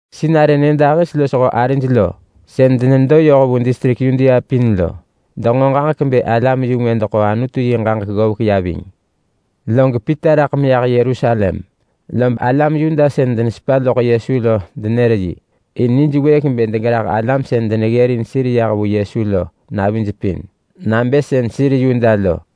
Sinarë nyëdahis losho arij lo sën denedo yoh vu distrik Yudea pin lo denġo ġaġek bë alam-yu-ngwë deḳo Anutu yi ġaġek ggovek ya ving. Log Pita raḳ meyah Yerusalem, lob alam Yuda sën denesepa loḳ Yesu lo denër yi, in nijwëëk bë degerah alam sën deneggërin sir yah vu Yesu lo navij pin nabë sën sir Yuda lo.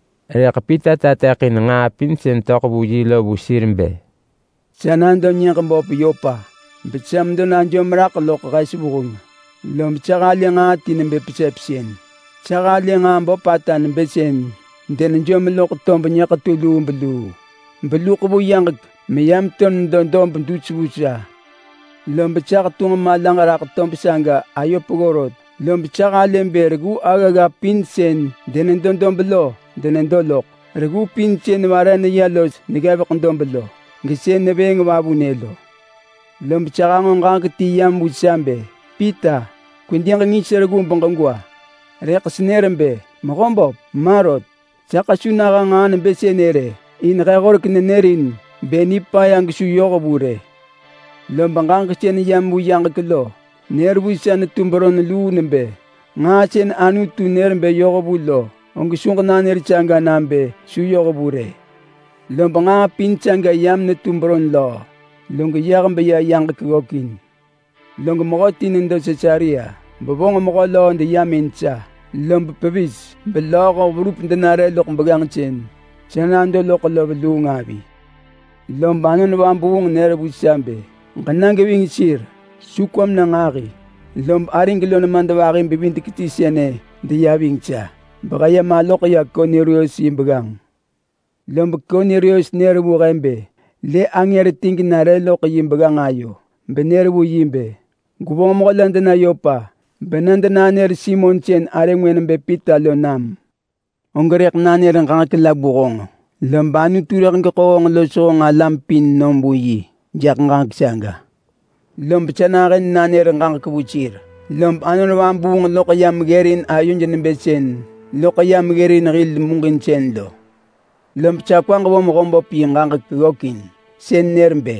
Rëḳ Pita tateḳin nġaa pin sën töḳ vu yi lo vu sir bë, “Sa nado nyëġ böp Yopa, besa medo najom raḳ loḳ hes vuheng, lob sa halë nġaa ti nebë pesepsën. Sa halë nġaa böpata nebë sën denejom loḳ tob nyëḳetu lubeluu, beluḳ vu yaġek meyam to nedo dob dus vu sa. Lob sa hetunġ malaġ raḳ tob saga ayo peggo rot, lob sa halë bë reggu aggagga pin sën denedo dob lo denedo loḳ. Reggu pin sën vare neya los neggevek dob lo, gesën nevëëng vavunë lo. Lob sa hanġo ġaġek ti yam vu sa bë, ‘Pita, kwedi ġengis reggu beġegwa!’ Rëḳ senër bë, ‘Mehöböp, ma rot! Saḳ su naha nġaa nebë sënë rë! In he horek nenërin bë nipaya gesu yohvu rë.’ Lob ġaġek sën yam vu yaġek lo nër vu sa netu beron luu nebë, ‘Nġaa sën Anutu nër bë yohvu lo, og su ġenanër saga nabë su yohvu rë!’ Lob nġaa pin saga yam netu beron löö, log yah beya yaġek ggökin. Log mehöti nedo Sisarea bevonġ mehö löö deyam in sa lob pevis belööho verup denare loḳ begganġ sën sa nado loḳ lo veluung avi. Lob Anon Vabuung nër vu sa bë, ‘Ġena geving sir. Su kwam na nġahi!’ Lob arig lo nemadvahi-bevidek-ti sënë deya ving sa behe ya maloḳ ya Kornelius yi begganġ. Lob Kornelius nër vu he bë lë angër ti genare loḳ yi begganġ ayo benër vu yi bë, ‘Gwevonġ mehö la dena Yopa bena denanër Simon sën arë ngwë nebë Pita lo nam. Og rëḳ nanër ġaġek la vu honġ, lob Anutu rëḳ geḳo honġ los honġ alam pin nom vu yi jaḳ ġaġek saga.’ Lob sa nahën nanër ġaġek vu sir, lob Anon Vabuung loḳ yam ggërin ayoj nebë sën loḳ yam ggërin hil muġinsën lo. Lob sa kwaġ vo Mehöböp yi ġaġek ggökin, sën nër bë,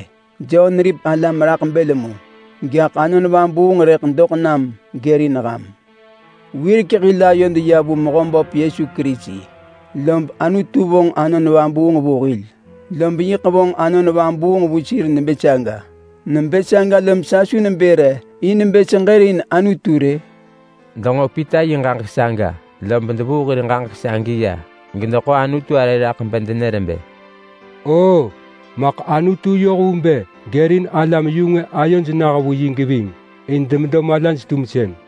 ‘Jon neripek alam raḳ bël mu, gaḳ Anon Vabuung rëḳ doḳ nam gërin ham.’ Wirek hil ayod ya vu Mehöböp Yesu Kerisi, lob Anutu vonġ Anon Vabuung vu hil, lob yiḳ vonġ Anon Vabuung vu sir nebë saga. Nebë saga lob sa su nebë re in bë seġërin Anutu rë?” Denġo Pita yi ġaġek saga, lob devuu hir ġaġek sagi ya gedeḳo Anutu arë raḳ bedenër bë, “Oo maḳ Anutu yoh vu bë gërin alam-yu-ngwë ayoj nah vu yi geving in demedo malaj-tumsën.”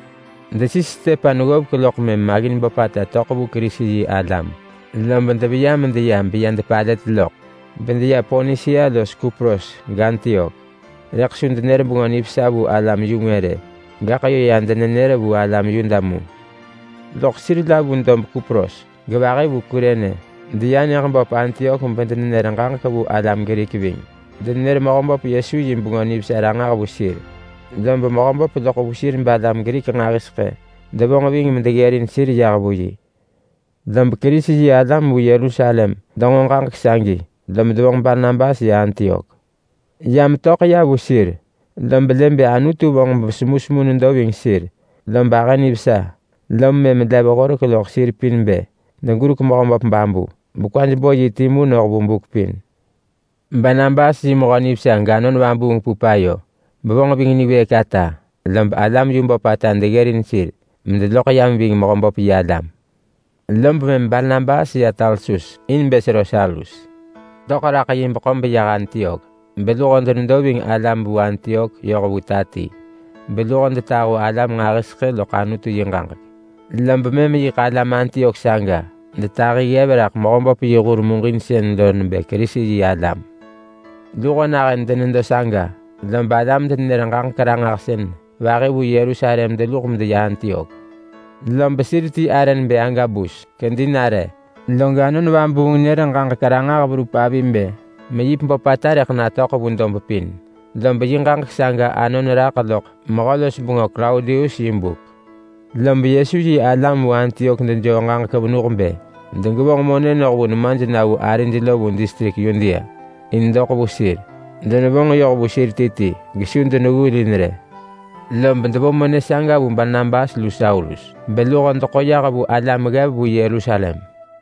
Desis Stepan ggovek loḳ mëm maggin böpata töḳ vu Kerisi-yi-alam, lob deveya medeya beya depalët loḳ bedeya Ponisia los Kupros gAntiok. Rëḳ su denër Bengö Nivesa vu alam-yu-ngwë rë. Gaḳ yö ya denenër vu alam Yuda mu. Loḳ sir la vu dob Kupros, gevahi vu Kurene, deya nyëġ böp Antiok bedenër ġaġek vu alam Grik ving. Denenër Mehöböp Yesu yi Bengö Nivesa ranġah vu sir, lob Mehöböp loḳ vu sir balam Grik nġahiseḳë devonġ ving medeggërin sir yah vu yi. Lob Kerisi-yi-alam vu Yerusalem denġo ġaġek sagi, lob devonġ Barnabas ya Antiok. Ya metöḳ ya vu sir lob lë bë Anutu vonġ semusemu benedo ving sir, lob ahë nivesa. Lom mëm lev horek loḳ sir pin bë degurek Mehöböp babu bekwaj bo yi timu noh vu buk pin. Barnabas yi mehö nivesa gAnon Vabuung pup ayo, bevonġ ving niwëëk ata. Lob alam yu böpata deggërin sir medeloḳ yam ving Mehöböp yi alam. Lob mëm Barnabas ya Tarsus in bë sero Saulus. Lob töḳ raḳ yi beḳo beyah Antiok, beluho denedo ving alam vu Antiok yoh vu ta ti, beluho detahu alam nġahiseḳë loḳ Anutu yi ġaġek. Lob mëm yiḳ alam Antiok saga detahi ggev raḳ Mehöböp yi hur muġinsën nebë Kerisi-yi-alam. Luho nahën denedo saga lob alam-denenër-ġaġek-ranġahsën vahi vu Yerusalem deluḳ medeya Antiok, lob sir ti arë nebë Agabus kedi nare, log Anon Vabuung nër ġaġek ranġah verup avi bë meyip böpata rëḳ natöḳ vu dob pin. Lob yi ġaġek saga anon raḳ loḳ mehö-los-bengö Klaudius yi buk. Lob Yesu yi alam vu Antiok dejoo ġaġek venuh bë degevonġ monë noh vu nemaj na vu arij lo vu distrik Yudea in doḳ vu sir. Denevonġ yoh vu sir ti ti, gesu deneggulin rë. Lob devo monë saga vu Barnabas lu Saulus beluho deḳo yah vu alam ggev vu Yerusalem.